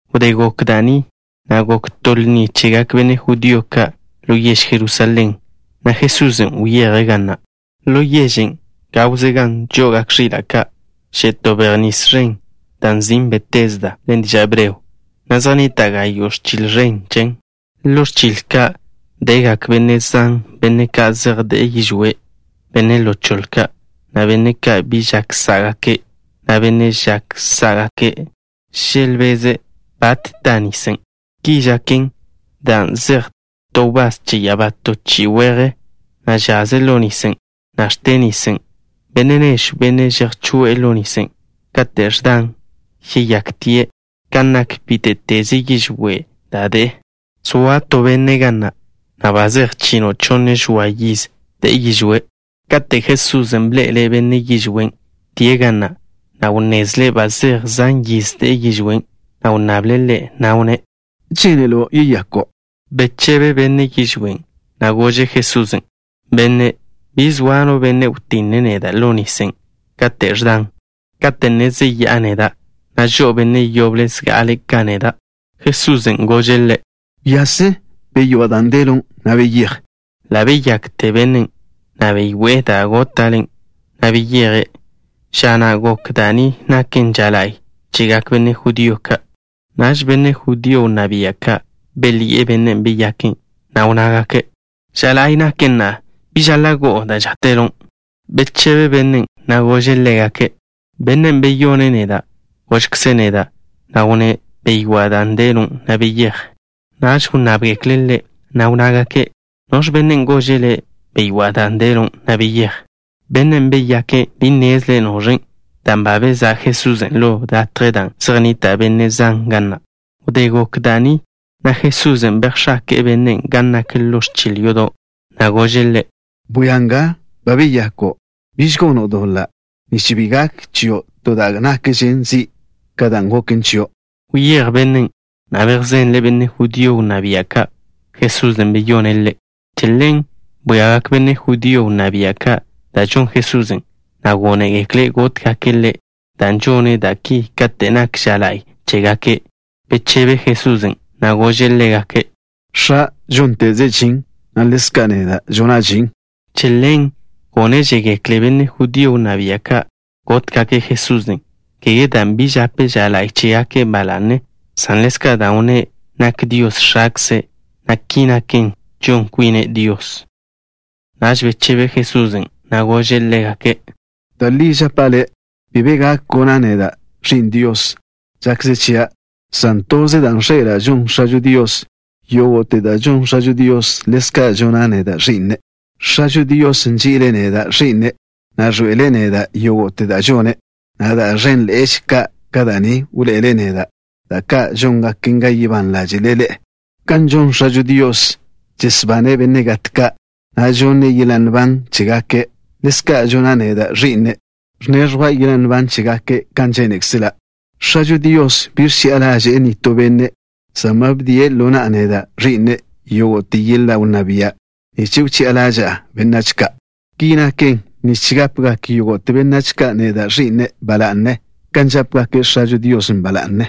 Wdé gok da' ni, gok to lni chegak benne' judío ka' ḻo yež Jerusalén, na' Jesusen' wyeje' ga na'. Ḻo yežen', gawze gan žo'ogak ẕila' ka', že' to bej nis ẕen, da' nzin' Betesda ḻen diža' hebreo, na' zej nnita' gayo' ẕchil ẕen chen. Ḻo ẕchil ka' degak benne' zan, benne' ka' zej de'e yižwé', benne' ḻo choḻe ka', na' benne' ka' bi žak sá'gake', na' benne' žak sá'gake'. Želbeze' bate ta nisen'. Ki žaken dan' žetj to wbás che ya'abá to chi'i weje, na' žaze' ḻo nisen', na' ẕte' nisen'. Benne' nežw, benne' chejchoé'e ḻo nisen' kate' ẕdan, yeyaktie' kan nak bíte'teze yižwé' da' de'e. Zoa to benne' ga na', ba zej chino' chonne žoa yiz de'e yižwé'. Katen' Jesusen' bḻe'ele' benne' yižwén' die' ga na', wnnezle' ba zej zan yiz de'e yižwén', na' wnnable' ḻe', na' wnné': —¿Žénelo' yeyako'? Bechebe benne' yižwén', na' gože' Jesusen': —Benne', bi zoa no benne' wtinne' neda' ḻo nisen' kate' ẕdan. Kate' ne zeyá'a neda', žo'o benne' yoble zga'ale' ka neda'. Jesusen' gože' ḻe': —Wyase. Beywá' dan' delon', na' beyéj. Ḻa' beyakte bennen', na' beywé'e da' góta'len', na' beyeje'. Ža na' gok da' ni naken ža la'y chegak benne' judío ka'. Naž benne' judío wnná bia' ka' belyi'e bennen' beyake', na' wnnágake': —Ža la'y naken na'a. Bi žaḻa' go'o da' žáte'lon'. Bechebe bennen', na' gože' ḻégake': —Bennen' beyone' neda' gožkze' neda', na' wnné': “Beywá' dan' delon', na' beyéj.” Naž wnnábgekle' ḻe', na' wnnágake': —¿Noẕ bennen' gože' le': “Beywá' da' delon', na' beyéj”? Bennen' beyake' bi nnezle' noẕen', dan' ba bezá' Jesusen' ḻo latjen' dan' zej nnita' benne' zan ga na'. Wdé gok da' ni, Jesusen' bejx̱ake'e bennen' gan nak ḻo ẕchil yodo', na' gože' ḻe': —Bwia nga. Ba beyako'. Biž gono' doḻa', nich bi gak chio' to da' nakže zi' ka dan' goken chio'. Wyéj bennen', na' bejzenle' benne' judío wnná bia' ka', Jesusen' beyone' ḻe'. Che ḻen bwíagak benne' judío wnná bia' ka' da' žon Jesusen', na' gónegekle' gótgake' Ḻe', dan' žone' da' ki kate' nak ža la'y chégake'. Bechebe Jesusen', na' gože' ḻégake': —X̱a' žónteze' žin, na' ḻezka' neda' žona' žin. Che ḻen gónežegekle benne' judío wnná bia' ka' gótgake' Jesusen', kégeze dan' bi žape' ža la'y chégake' ba la'ne, san ḻezka' dan' wnné' nak Dios X̱akze', na' ki naken, žon kwine' Dios. Naž bechebe Jesusen', na' gože' ḻégake': —Da' li žapa' ḻe'e. Bi be gak gona' neda', Ẕi'n Dios, žakze chia', san toze dan' ẕḻe'ela' žon X̱ažo Dios. Yógo'te da' žon X̱ažo Dios, ḻezka' žona' neda', Ẕi'ne'. X̱ažo Dios nži'ile' neda', Ẕi'ne', na' ẕḻoe'ele' neda' yógo'te da' žone', na' da' ẕénḻe'eže ka' ka da' ni wḻoe'ele' neda', da' ka' góngaken ga yebán ḻáže'le ḻe'e. Kan žon X̱ažo Dios, žesbane' benne' gat ka', na' žonne' yeḻa' nban chégake', ḻezka' žona' neda', Ẕi'ne', ẕneẕjwa' yeḻa' nban chégake' kan žénekzela'. X̱ažo Dios bi ẕchi'a ḻaže'e nitó benne', san ba bdie' ḻo na'a neda', Ẕi'ne', yógo'te yeḻa' wnná bia' nich wchi'a ḻaža'a benách ka'. Ki naken nich gápegak yógo'te benách ka' neda', Ẕi'ne', ba la'ne, kan žápegake' X̱ažo Dios ba la'ne.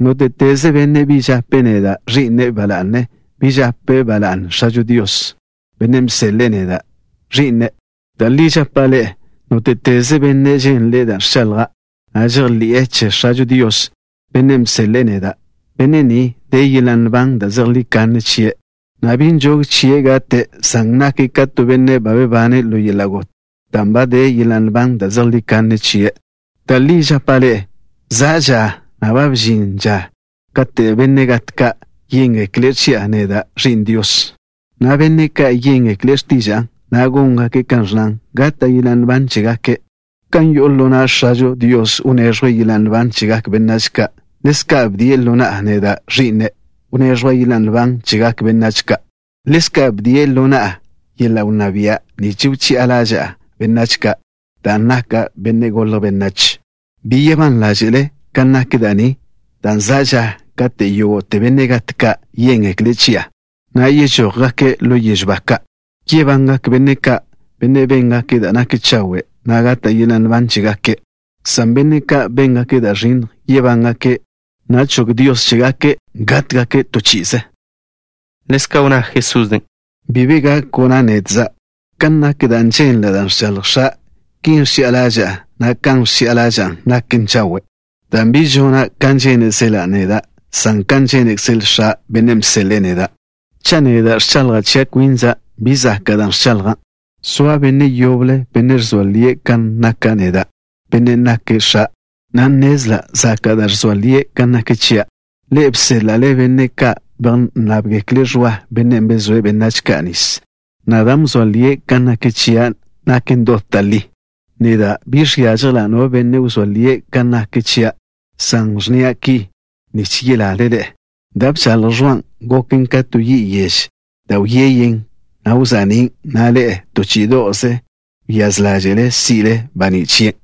Nóte'teze benne' bi žape' neda', Ẕi'ne', ba la'ne, bi žape' ba la'ne X̱ažo Dios, Bennen' bseḻe'e neda', Ẕi'nen'. ’Da' li žapa' ḻe'e. Nóte'teze benne' ženle' da' ẕchaḻja', na' žejḻi'e che X̱ažo Dios, Bennen' bseḻe'e neda', benne' ni de yeḻa' nban da' zejlí kanne chie', na' bi nžog chie' gate', san nake' ka to benne' ba bebane' ḻo yeḻa' got dan' ba de yeḻa' nban da' zejlí kanne chie'. Da' li žapa' ḻe'e, za' ža, na' ba ẕžin ža na', kate' benne' gat ka' yéngekle' chi'a neda', Ẕi'n Dios, na' benne' ka' yéngekle' x̱tiža'a, na' góngake' kan ẕnnan, gata' yeḻa' nban chégake'. Kan yo'o ḻo na' X̱ažo Dios wneẕjwe' yeḻa' nban chegak benách ka', ḻezka' bdie' ḻo na'a neda', Ẕi'ne', wneẕjwa' yeḻa' nban chegak benách ka'. Ḻezka' bdie' ḻo na'a yeḻa' wnná bia' nich wchi'a ḻaža'a benách ka' dan' naka' Benne' Golje' Benách. Bi yebán ḻáže'le kan nak da' ni, dan' za' ža kate' yógo'te benne' gat ka' yéngekle' chi'a, na' yežójgake' ḻo yežw ba ka'. Yebangak benne' ka', benne' béngake' da' nak chawe', na' gata' yeḻa' nban chégake', san benne' ka' béngake' da' ẕinnj, yebángake', na' chog Dios chégake' gátgake' to chi'ize. Ḻezka' wnná Jesusen': —Bi be gak gona' nedza'. Kan nak da' ženla' da' ẕchaḻj X̱a', ki ẕchi'a ḻaža'a, na' kan ẕchi'a ḻaža'a naken chawe', dan' bi žona' kan žénezela' neda', san kan žénekzele X̱a', Bennen' bseḻe'e neda'. Cha' neda' ẕchaḻja' chia' kwinza', bi zaka' dan' ẕchaḻja'. Zoa Benne' yoble, Benne' ẕzoa lie' kan naka' neda', Bennen' nake' X̱a', na' nnezla' zaka' da' ẕzoa lie' kan nak chia'. Ḻe'e bséḻa'le benne' ka' bejnnábgekle' Ẕwa, bennen' bezóe' benách ka' nis, na' dan' bzoa lie' kan nak chia' naken dot da' li. Neda' bi žiážjela' no benne' wzóa lie' kan nak chia', san ẕnnia' da' ki nich yelale ḻe'e. Da' bchaḻj Ẕwan' goken ka to yi' yež, da' wyeyen, na' wza'nín', na' ḻe'e, to chí'ido'ze wyáz ḻáže'le si'le baní' chien'.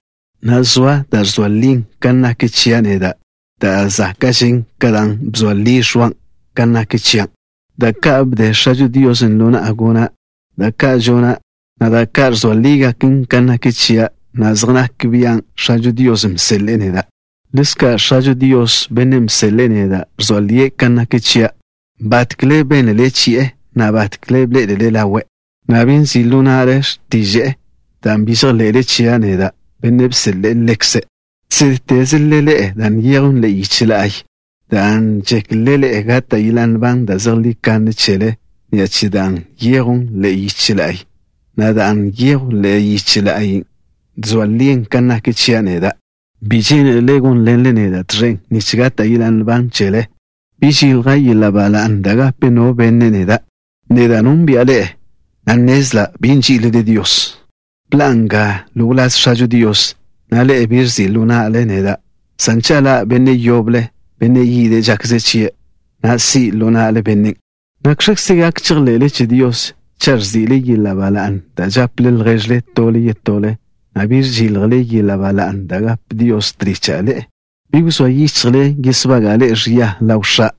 Na'a, zoa da' ẕzoa li kan nak chia' neda' da' záka'žen ka dan' bzoa li Ẕwan' kan nak chia'. Da' ka' bde X̱ažo Dios ḻo na'a gona', da' ka' žona', na' da' ka' ẕzoa lígaken kan nak chia', na' zej nak bian' X̱ažo Dios bseḻe'e neda'. Ḻezka' X̱ažo Dios, Bennen' bseḻe'e neda' ẕzoa lie' kan nak chia'. Batkle bénlele chi'e, na' batkle bḻé'elele ḻawe', na' bi nzi' ḻo na'le x̱tiže'e, dan' bi žejḻe'le chia' neda', Bennen' bseḻe'e Ḻekze'. Žsédtezle ḻe'e da' nyejw ḻe'e yiche la'y, dan' žéklele gata' yeḻa' nban da' zejlí kanne chele ni'a che dan' nyejwn ḻe'e yiche la'y, na' dan' nyejwn ḻe'e yiche la'y na' ẕzoa lin kan nak chia' neda'. Bi žénelele gónḻenle neda' tẕen nich gata' yeḻa' nban chele. ’Bi žilja' yeḻa' ba la'ne da' gape no benne' neda'. Neda' nónbi'a ḻe'e, na' nnezla' bi nží'ilele Dios. Bḻa'a nga ḻo wláz X̱ažo Dios, na' ḻe'e bi ẕzi' ḻo na'le neda', san cha' ḻa' benne' yoble, benne' yide' žakze chie', si' ḻo na'le bennen'. ¿Nakx̱kze gak chejḻe'le che Dios cha' ẕzi'le yeḻa' ba la'ne da' žaple lježle tole yetole, na' bi žiljle yeḻa' ba la'ne da' gape Dios tlicha' ḻe'e? Bi wzóa yichjle yesbaga'a ḻe'e ẕia ḻaw X̱a'.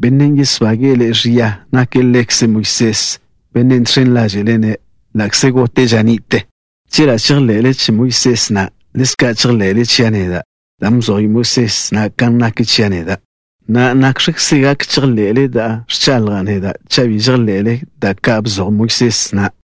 Bennen' yesbage'e ḻe'e ẕia nake' ḻekze Moisés, bennen' žx̱en ḻáže'le-ne', ḻa'kze gote' ža ni'te. Chela' žejḻe'le che Moisés na', ḻezka' chejḻe'le chia' neda', dan' bzoj Moisés na' kan nak chia' neda'. Na'a, ¿nakx̱kze gak chejḻe'le da' ẕchaḻja' neda' cha' bi žejḻe'le da' ka' bzoj Moisés na'?